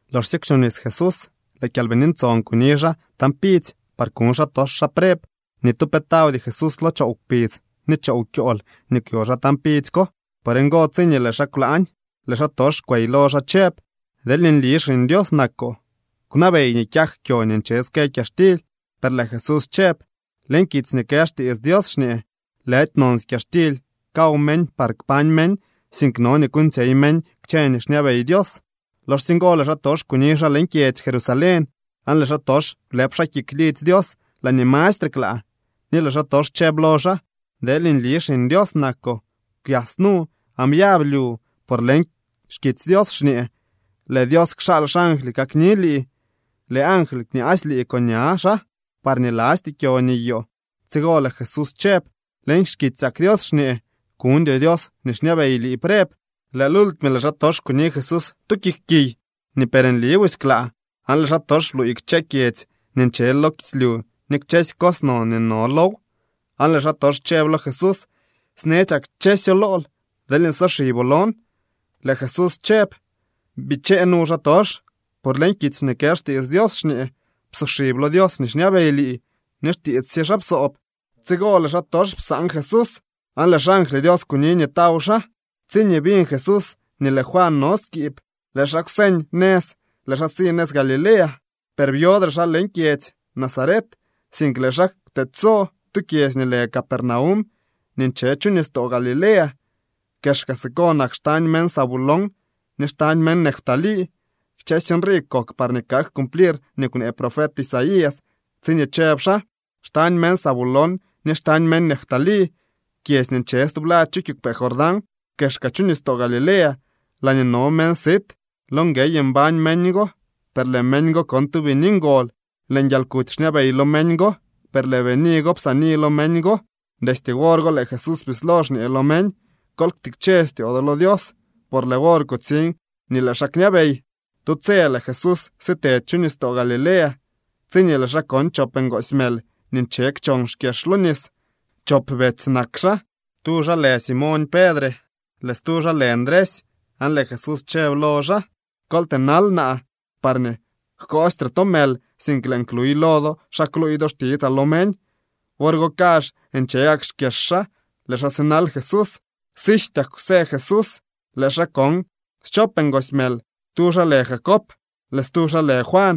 Loxsye kwchobnis Jesús, lëë Kyalbini Ntson kuni xaa tañ pidzy par kuñ xaatox xaa preb. Ni tu pe tawdy Jesús lo choow kpidz ni choow kyool nii kwyo xaa tañ pidzy ko. Por ngo, tsiñee lëë xaa kwlaañ, lëë xaatox kwey lo xaa chëb: —Deelñee nli Xiñ Dios nakoo, kwnabey nii kyak kyo nii nche ske kyaxtily. Per lëë Jesús chëb: —Leñ kitsy nii kë xtiits Dios xñee: “Lëdy nonsy kyaxtily kaw meñ parñee kpañ meñ, sink no nii kuuñtsyey meñ kchë nii xñabey Dios.” Loxsye ngo lëë xaatox kuni xaa leñ kyedzy Jerusalén, aan lëë xaatox blëëp xaa kik lidzy Dios laañee mastre klaa, ni lëë xaatox chëb lo xaa: —Deel nli Xiñ Dios nakoo, kwyas nu aan byab lyu, por leñ xkitsy Dios xñee: Lëë Dios kxaal xangly kakni lii. Lëë angly kñaasy lii con ña xaa, parñee lasty kyo niyoo. Tsigo lëë Jesús chëb: —Leñ xkitsyak Dios xñee: “Kuñdyoo Dios nii xñabey lii preb.” Lëë lultime lëë xaatox kuni Jesús tu kik kiy nii per nli busy klaa, aan lëë xaatox bluuy kchësy kyedzy nii nche lo kislyu ni kchësy cos non nii no low, aan lëë xaatox chëb lo Jesús: —Snetsyaa kchësyo lool deelñee soxiboo lon. Lëë Jesús chëb: —Bichee nu, xaatox, por leñ kitsy nii kë xtiits Dios xñee: “Psoxib lo Dios nii xñabey lii ni xtiits sye xaa psoob.” Tsigo lëë xaatox psaan Jesús aan lëë xangly Dios kuni nii taw xaa. Tsiñee biñ Jesús nii lëë Juan no skiib, lëë xaa kwseñ nëz, lëë xaa si nëz Galilea. Per byodre xaa leñ kyedzy Nazaret, sink lëë xaa kwtedyso tu kyedzy nii lë Capernaum nii nche chu nistoo Galilea. Kexka siko nak xtañ meñ Zabulón ni xtañ meñ Neftalí. Kchësy nrii kok parñee kak cumplir nii kwnee profet Isaías tsiñee chëb xaa: Xtañ meñ Zabulón ni xtañ meñ Neftalí, kyedzy nii nche stublad chu kiigwpee Jordán, kexka chu nistoo Galilea, laañee no meñ sit. Lo nguey mbañ meñ go, per lëë meñ go kon tu bini ngol. Lëë nguialkuty xñabey lo meñ go, per lëë bini go psaani lo meñ go. Destye wor go lëë Jesús bislo xñee lo meñ: —Kol ktikche styoo do lo Dios, por lëë wor kutsiñ nii lëë xaa kñabey. Tu tse lëë Jesús sitedy chu nistoo Galilea, tsiñee lëë xaa kon chop ngoosy mël nii nche kchon xkyex lo nis. Chop betsy nak xaa. Tu xaa lë Simoñ Pedre, lëë stu xaa lë Ndresy. Aan lëë Jesús chëb lo xaa: —Kol tënal naa parñee jkoostre to mël, sink lëën kluy lo do xa kluuy do xtitsaa lo meñ. Wor go kazh nche gak xkyex xaa, lëë xaa sinal Jesús. Sijtyak kwsë Jesús, lëë xaa kon schop ngoosy mël. Tu xaa lë Jacob, lëë stu xaa lë Juan.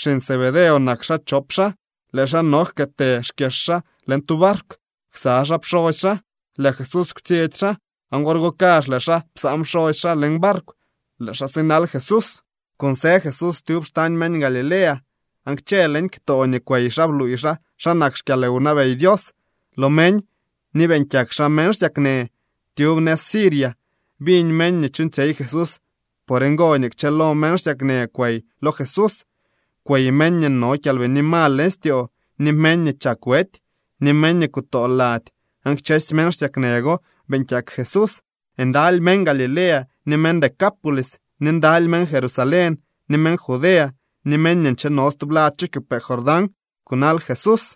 Xiñ Zebedeo nak xaa chop xaa. Lëë xaa no jkëtë xkyex xaa leñ tu barkw ksa xaa pxosy xaa. Lëë Jesús kwtsyetsy xaa, aan wor go kazh lëë xaa psaan pxosy xaa leñ barkw. Lëë xaa sinal Jesús. Kunsë Jesús tyub xtañ meñ Galilea, aan kchë leñ ktoo nii kwey xaa bluuy xaa xa nak xkyalwnabey Dios lo meñ, ni beeñ kyak xaa meñ xsyaknë. Tyub nëz Siria biñ meñ nii chuuñtsyey Jesús. Por ngo nii kchëlo meñ xsyaknë kwey lo Jesús. Kwey meñ nii no kyalbini mal leñ styoo, ni meñ nii chak wety, ni meñ nii kutoo lady, aan kchësy meñ xsyaknë go beeñ kyak Jesús. Ndaly meñ Galilea, ni meñ Decápolis, ni ndaly meñ Jerusalén, ni meñ Judea, ni meñ nii ncheno stublad chu kiigwpee Jordán kunal Jesús.